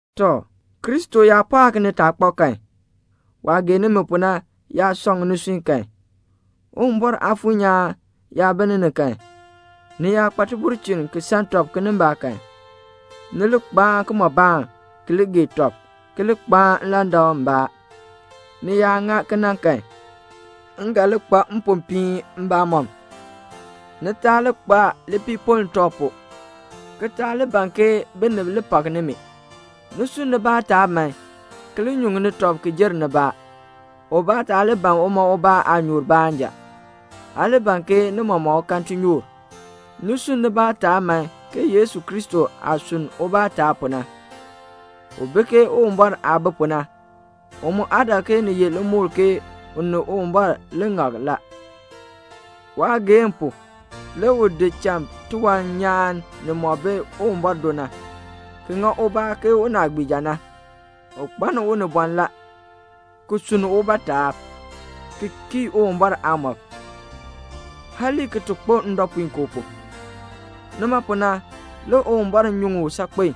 Tɔ, Kristo yaa pɔɔk nitaakpab kan, waah gee nimi pu na yaa sɔŋ nisui kan, Uwumbɔr Aafuur nyaan yaa bi ni ni kan, ni yaa kpa tibulchin ki san tɔb kinimbaak kan, ni li kpaan kimɔbaan, ki li gee tɔb, ki li kpaan nlandak mbaa. Ni yaa ŋa kena kan, m ga li kpa mpopiin mbamɔm. Ni taa li kpa lipiipoln tɔb pu, ki taa li ban ke binib li pak nimi. Ni sunn nibaa taab man, ki li nyuŋni tɔb ki jer nibaa. Ubaa taa li ban uma ubaa aanyoor baanja. Aa li ban ke ni mɔmɔk kan tinyoor. Ni sunn nibaa taab man ke Yesu Kristo aah sunn ubaa taab pu na. U bi ke Uwumbɔr aah bi pu na. U mu aa dak ke ni ye limukl u ni Uwumbɔr li beenin ŋak la. Waageehn pu le u di cha tiwan nyaan nimɔk bi Uwumbɔr do na, ki ŋa ubaa ke unaagbiija na. U kpaln unibɔn la, ki sunn ubaa taab, ki kii Uwumbɔr aamɔb, hali ki ti kpo ndɔpuinkoo pu. Nima pu na le Uwumbɔr nyuŋ u saakpen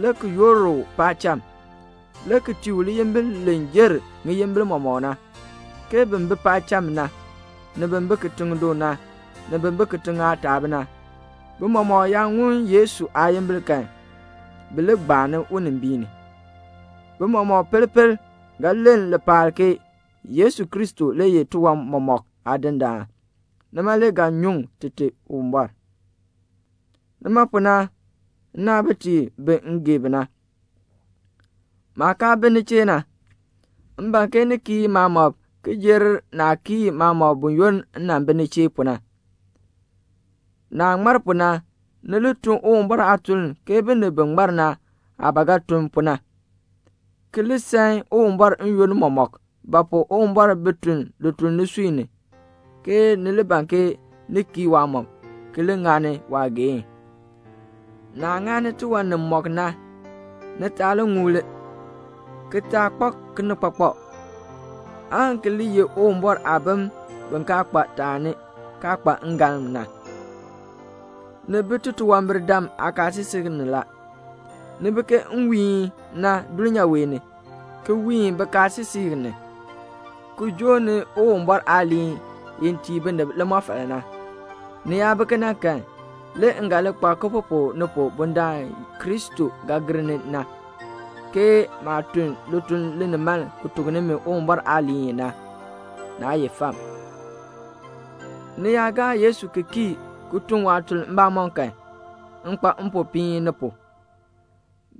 le ki yoor u paacham, le ki tii u liyimbil li jer ŋiyimbil mɔmɔk na, ke bin bi paacham na, ni bin bi kitiŋ du na, ni bin bi kitiŋ aataab na, bi mɔmɔk yaa ŋun Yesu aayimbil kan, bi li gbaani unimbiin ni. Bi mɔmɔk pel pel ga len lipaal ke Yesu Kristo le ye tiwan mɔmɔk Aadindaan. Nima le ga nyuŋ Tite Uwumbɔr. Nima pu na, nnaabitiib bi m gee bi na, maah kaa bi ni chee na, m ban ke ni kii maamɔb ki jer naah kii maamɔb buyoonn m nan bi ni chee pu na. Naah ŋmar pu na, ni li tun Uwumbɔr aatuln ke binib bi ŋmar na aah ba ga tun pu na, ki li san Uwumbɔr n-yoonn mɔmɔk; ba pu? Uwumbɔr bi tun lituln nisui ni, aan ni li ban ni kii waamɔb, ki li ŋani waageehn. Naah ŋani tiwan nimɔk na, ni taa ŋuli, ki taa kpak kinikpakpak, aan ki li ye Uwumbɔr aabim bi kaa kpa taani, kaa kpa ngalm na. Ni bi titunwambirdam aakaasisik ni la. Ni bi ke nwiihn na dulnyaa wee ni ki wiin bikaasisik ni, ki joo ni Uwumbɔr aaliin i tii binib limɔfal na. Ni yaa bi kena kan, le m ga nyu baalaa ni pu bundaln Kristo ga gir ni na, ke maah tun lituln linimaln ki tuk nimi Uwumbɔr aaliin na, naa ye fam. Ni yaa gaa Yesu ki kii ki tun waatuln mbamɔm kan, m kpa mpopiin ni pu.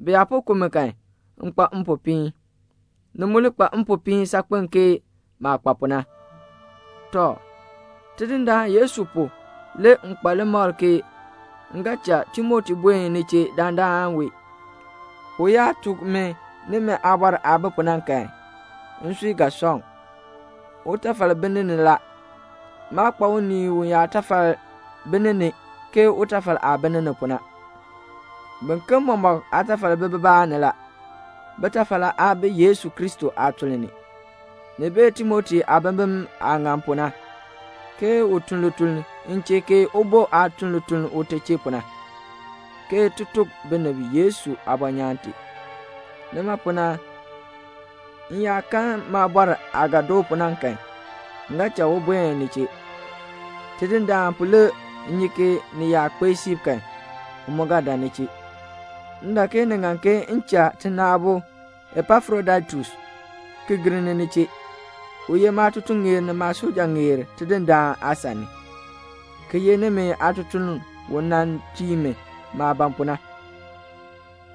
Bi yaa po ku mi kan, m kpa mpopiin. Ni mu li kpa mpopiin saakpen ke maah kpa pu na. Tɔ, Tidindaan Yesu pu le m kpa limakl ke m ga cha Timoti buen ni chee dandana wee. U yaa tuk mi nimi aabɔr aah bi pu na kan, nsui ga sɔŋ. Utafal bi ni ni la. Maa kpa unii uyaatafal bi ni ni, ke utafal aah bi ni ni pu na. Biken mɔmɔk aatafal bi bibaa ni la. Bitafal aa bi Yesu Kristo aatuln ni. Ni bee Timoti aabimbin aah ŋan pu na, ke u tun lituln m chee ke ubo aah tun lituln ute chee pu na, ke ti tuk binib Yesu aabɔnyaan tee. Nima pu na, m yaa kan maabɔr aah ga doo pu na kan, m ga cha u buen ni chee. Tidindaan pu le m nyi ke ni yaa kpee siib kan, m mu ga dan ni chee. M dak ke ni ŋan ke m cha tina aabo Epafrodaitus ki gir ni ni chee. U ye maatutuŋeer ni maasujaŋeer Tidindaan aasan ni, ki ye nimi aatutuln u dan nan tii mi maah ban pu na.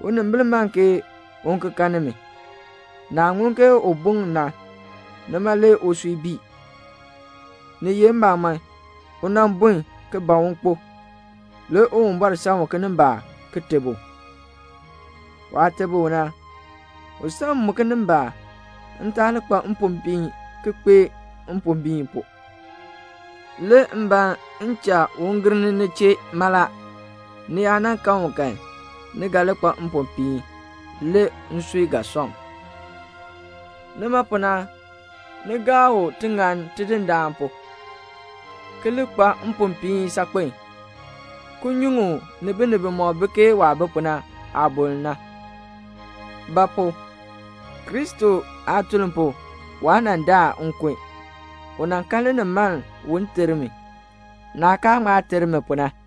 Unimbil man ke un ki kan nimi. Naah ŋun ke u bun na, nima le usui bii. Ni ye mbamɔn, u nan bun ki ban un kpo, le Uwumbɔr san u kinimbaak ki teb u. Waah teb u na, u san m mu kinimbaak, m taa li kpa mpombiin ki kpee mpombiin pu. Le m ban m cha u gir ni ni chee mala, ni yaa nan kan u kan, ni ga li kpa mpopiin. Le nsui ga sɔŋ. Nima pu na, ni gaa u tiŋann Tidindaan pu, ki li kpa mpopiin saakpen, ki nyuŋ u ni binib bimɔk bi ke waah bi pu na aaboln na; ba pu? Kristo aatuln pu waa nan daa nkun. U nan kan linimaln un ter mi, naah kaa ŋma ter mi pu na.